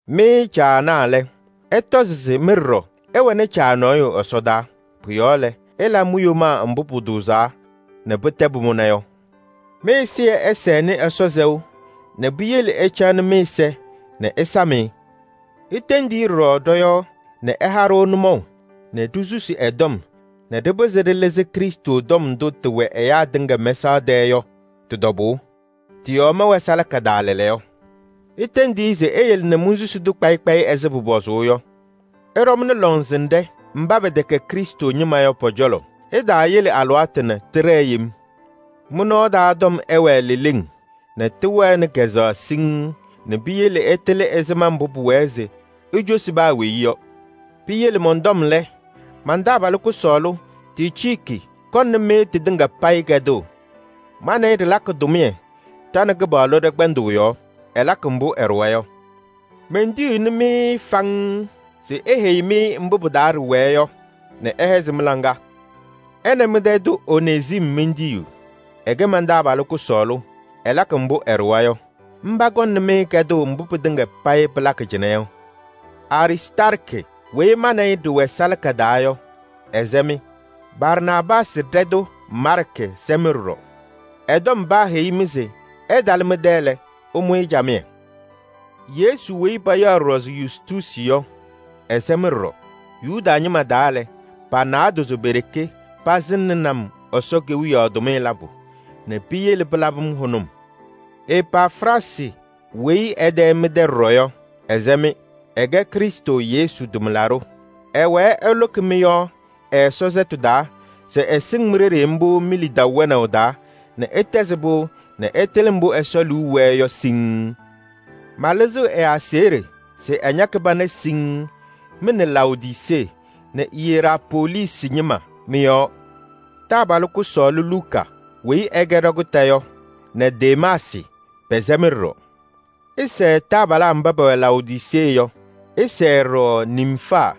Mɩ caanaa lɛ, ɩtɔzɩ se mɩ ɖɔɖɔ ɩwɛnɩ Caa nɔɔyʋ ɛsɔdaa. Pʋ-yɔɔ lɛ, ɩla mi-yomaa mbʋ pʋtʋʋzaa nɛ pɩtɛ pʋmʋna yɔ. Mɩ-ɛzɩyɛ ɛsɛnɩ Ɛsɔ sɛʋ nɛ piyele ɩcaɣnɩ mɩ-ɛza nɛ ɩsam-ɩ. Itendi-i ɖɔɖɔ ɖɔ-yɔɔ nɛ ɛha-ɖʋ nʋmɔʋ nɛ ɖisusi ɛ-tɔm nɛ ɖɩpɩzɩ ɖɩlɩzɩ Krɩstʋ tɔm ndʋ tɩwɛ ɛyaa tɩŋa mɛsaɣ tɛɛ yɔ tɩ-tɔbʋʋ. Tɩ-yɔɔ mɛwɛ salaka taa lɛɛlɛɛyɔ. Itendi-i se eyele nɛ monsusi-tʋ kpayɩ kpayɩ ɛzɩ pʋpɔzʋʋ yɔ. Ɩɖɔmnɩ lɔŋsɩnɖɛ mba pɛtɛkɛ Krɩstʋ ñɩma yɔ pɔ-cɔlɔ. Ɩtaayele alɩwaatʋ nɛ tɩɖɛɛ yem. Mɩ-nɔɔ taa tɔm ɛwɛɛ leleŋ nɛ tɩwɛnɩ kazʋwa siŋŋ nɛ piyele ɩtɩlɩ ɛzɩma mbʋ pʋwɛɛ se icosi paa weyi yɔ. Piyele mɔn-tɔm lɛ, man-taabalʋ kʋsɔɔlʋ Ticiiki kɔŋnɩ-mɩ tɩtɩŋa payɩ kɛdʋʋ. Ma nɛ ɩ ɖɩlakɩ tʋmɩyɛ ɖa nɛ Kɩpaɣlʋ ɖɛ-kpɛndʋʋ yɔɔ. Ɛlakɩ mbʋ ɛɖʋwa yɔ. Mentiyiɣni-mɩ-ɩ faŋŋ se eheyi-mɩ mbʋ pɩ-taa ɖɩwɛɛ yɔ nɛ ɛhɛzɩ mɩ-laŋa. Ɛ nɛ mɩ-tɛ tʋ Onezim mentiyiɣ. Ɛkɛ man-taabalʋ kʋsɔɔlʋ, ɛlakɩ mbʋ ɛɖʋwa yɔ. Mba kɔŋnɩ-mɩ kɛdʋʋ mbʋ pɩtɩŋa payɩ pɩlakɩ cɩnɛ yɔ. Aristaarkɩ weyi ma nɛ ɩ ɖɩwɛ salaka taa yɔ, ɛsɛ-mɩ. Barnaabaasɩ ɖɛtʋ Maarkɩ sɛ-mɩ ɖɔɖɔ. Ɛ-tɔm paaheyi-mɩ se ɛtalɩ mɩ-tɛ lɛ, ɩmʋ-ɩ camɩyɛ. Yesu weyi payaɣ ɖɔɖɔ se Yustuusi yɔ, ɛsɛ-mɩ ɖɔɖɔ. Yuda ñɩma taa lɛ, pa-naadozo pe-ɖeke pasɩŋnɩnɩ-m Ɛsɔ Kewiyaɣ tʋmɩyɛ labʋ nɛ piyele pɩlabɩ-m hʋnʋm. Epafraasɩ weyi ɛ-tɛ mɩ-tɛ ɖɔɖɔ yɔ, ɛsɛ-mɩ. Ɛkɛ Krɩstʋ Yesu tʋmlaɖʋ, ɛwɛɛ ɛlʋkɩ mɩ-yɔɔ ɛ-Ɛsɔ sɛtʋ taa se ɩsɩŋ mi-ɖeɖe mbʋ mi-lidaʋ wɛnaʋ taa nɛ ɩtɛzɩ pɩʋ nɛ ɩtɩlɩ mbʋ Ɛsɔ liu wɛɛ yɔ siŋŋ. Malɩzɩɣ ɛ-aseɣɖe se ɛñakɩ pana siŋŋ mɩ nɛ Laodisee nɛ Iyerapoolisi ñɩma mɩ-yɔɔ. Taabalʋ kʋsɔɔlʋ Luka weyi ɛkɛ ɖakʋta yɔ nɛ Demaasɩ pɛsɛ-mɩ ɖɔɖɔ. Ɩsɛɛ taabalaa mba pɛwɛ Laodisee yɔ. Ɩsɛɛ ɖɔɖɔ Nimfaa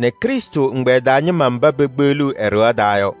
nɛ Krɩstʋ ɛgbɛyɛ taa ñɩma mba pekpeɣliɣ ɛ-ɖɩɣa taa yɔ.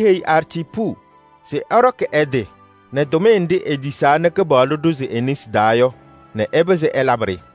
Iheyi Arciipu se ɛɖɔkɩ ɛ-tɩ nɛ tʋmɩyɛ nɖɩ etisaa nɛ Kɩpaɣlʋ ɖʋzɩ e-nesi taa yɔ nɛ ɛpɩzɩ ɛlabɩ-ɖɩ.